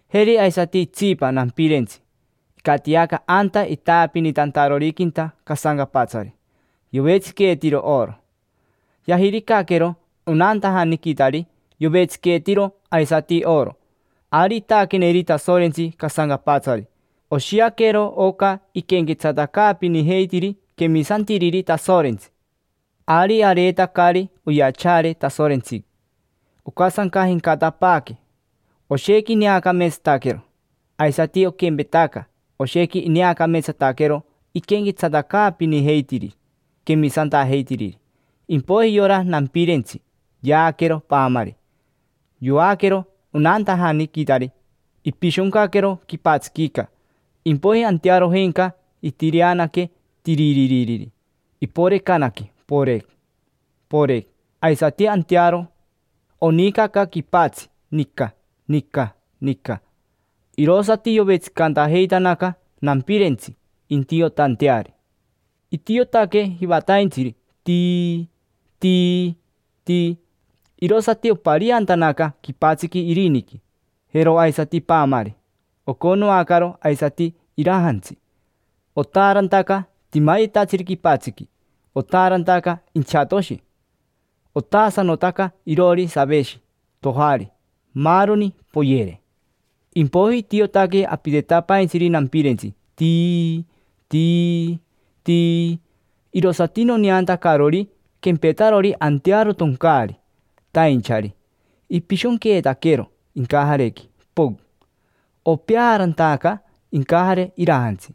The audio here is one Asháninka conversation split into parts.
Jeri aisati itsipa nampirentsi, icatiaca anta itaapinitantaroriquinta casancapatsari, yovetsiqueetiro oro. Yajiricaquero onantajaniquitari yovetsiqueetiro aisati oro. Ari itaaqueneri Tasorentsi casancapatsari, oshiaquero oca iquenquetsatacaapinijeitiri quemisantiriri Tasorentsi. Ari areetacari oyachaare Tasorentsiqui, ocasancajencatapaaque, oshequi ineacameetsataquero. Aisati oquempetaca, oshequi ineacameetsataquero iquenquetsatacaapinijeitiri quemisantajeitiriri. Impoiji yora nampirentsi yaaquero paamari, yoaquero onantajaniquitari, ipishoncaquero quipatsiquica. Impoiji antearojenca itireanaque, tiriririri; iporecanaque, porec, porec; aisati antearo onicaca quipatsi, nica, nica, nica. Irosati yovetsicantajeitanaca nampirentsi intiotanteari. Itiotaque jivataintsiri, tii, tii, tii; irosati opariantanaca quipatsiqui iriniqui, jero aisati paamari, oconoacaro aisati irajantsi. Otaarantaca timayetatsiri quipatsiqui, otaarantaca inchatoshi; otaasanotaca iroori saveshi, tojari, maaroni, poyere. Impoiji itiotaque apitetapaintsiri nampirentsi, tii, tii, tii; irosati noneantacarori quempetarori antearo toncaari, tainchari: ipishonqueetaquero incajarequi, pocn. Opeaarantaca incajare irajantsi,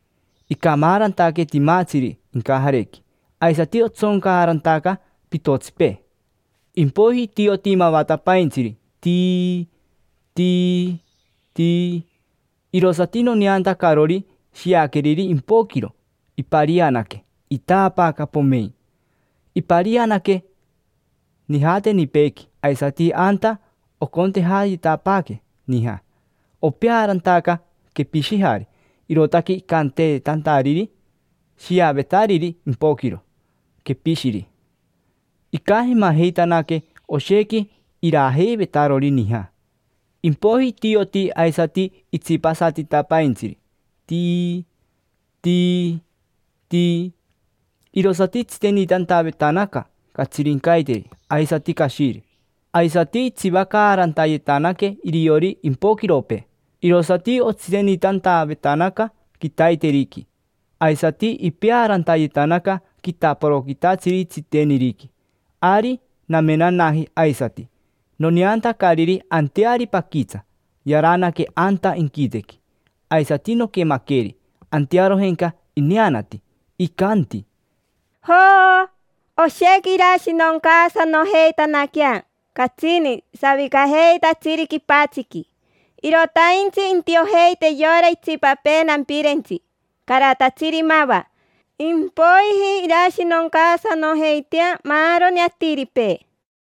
icamaarantaque timatsiri incajarequi, aisati otsoncaarantaca pitotsipee. Impoiji itioti mavatapaintsiri, tii, tii, tii; irosati noneantacarori shiaqueriri impoquiro iparianaque, itaapaaca, pomein. Iparianaque nijatenipeequi aisati anta ocontejayetapaaque nija. Opeaarantaca quepishijari, irootaque icantanteetariri shiavetariri impoquiro: Quepishiri. Icamajeitanaque oshequi irajeivetarori nija. Impoiji itioti aisati itsipasatitapaintsiri, tii, tii, tii; irosati itsitenitantavetanaca catsirincaiteri aisati cashiri. Aisati itsivacaarantayetanaque iriori impoquiropee, irosati otsitenitantavetanaca quitaiteriqui. Aisati ipeaarantayetanaca quitaporoquitatsiri tsiteniriqui. Ari namenanaji aisati, noneantacariri anteari paquitsa yaranaque anta inquitequi. Aisati noquemaqueri, antearojenca ineanati, icanti: —Jo, oshequi irashinoncaasanojeitanaquea catsini savicajeitatsiri quipatsiqui. Irotaintsi intiojeite yora itsipapee nampirentsi, caratatsiri mava, impoiji irashinoncaasanojeitea maaroni atiripee.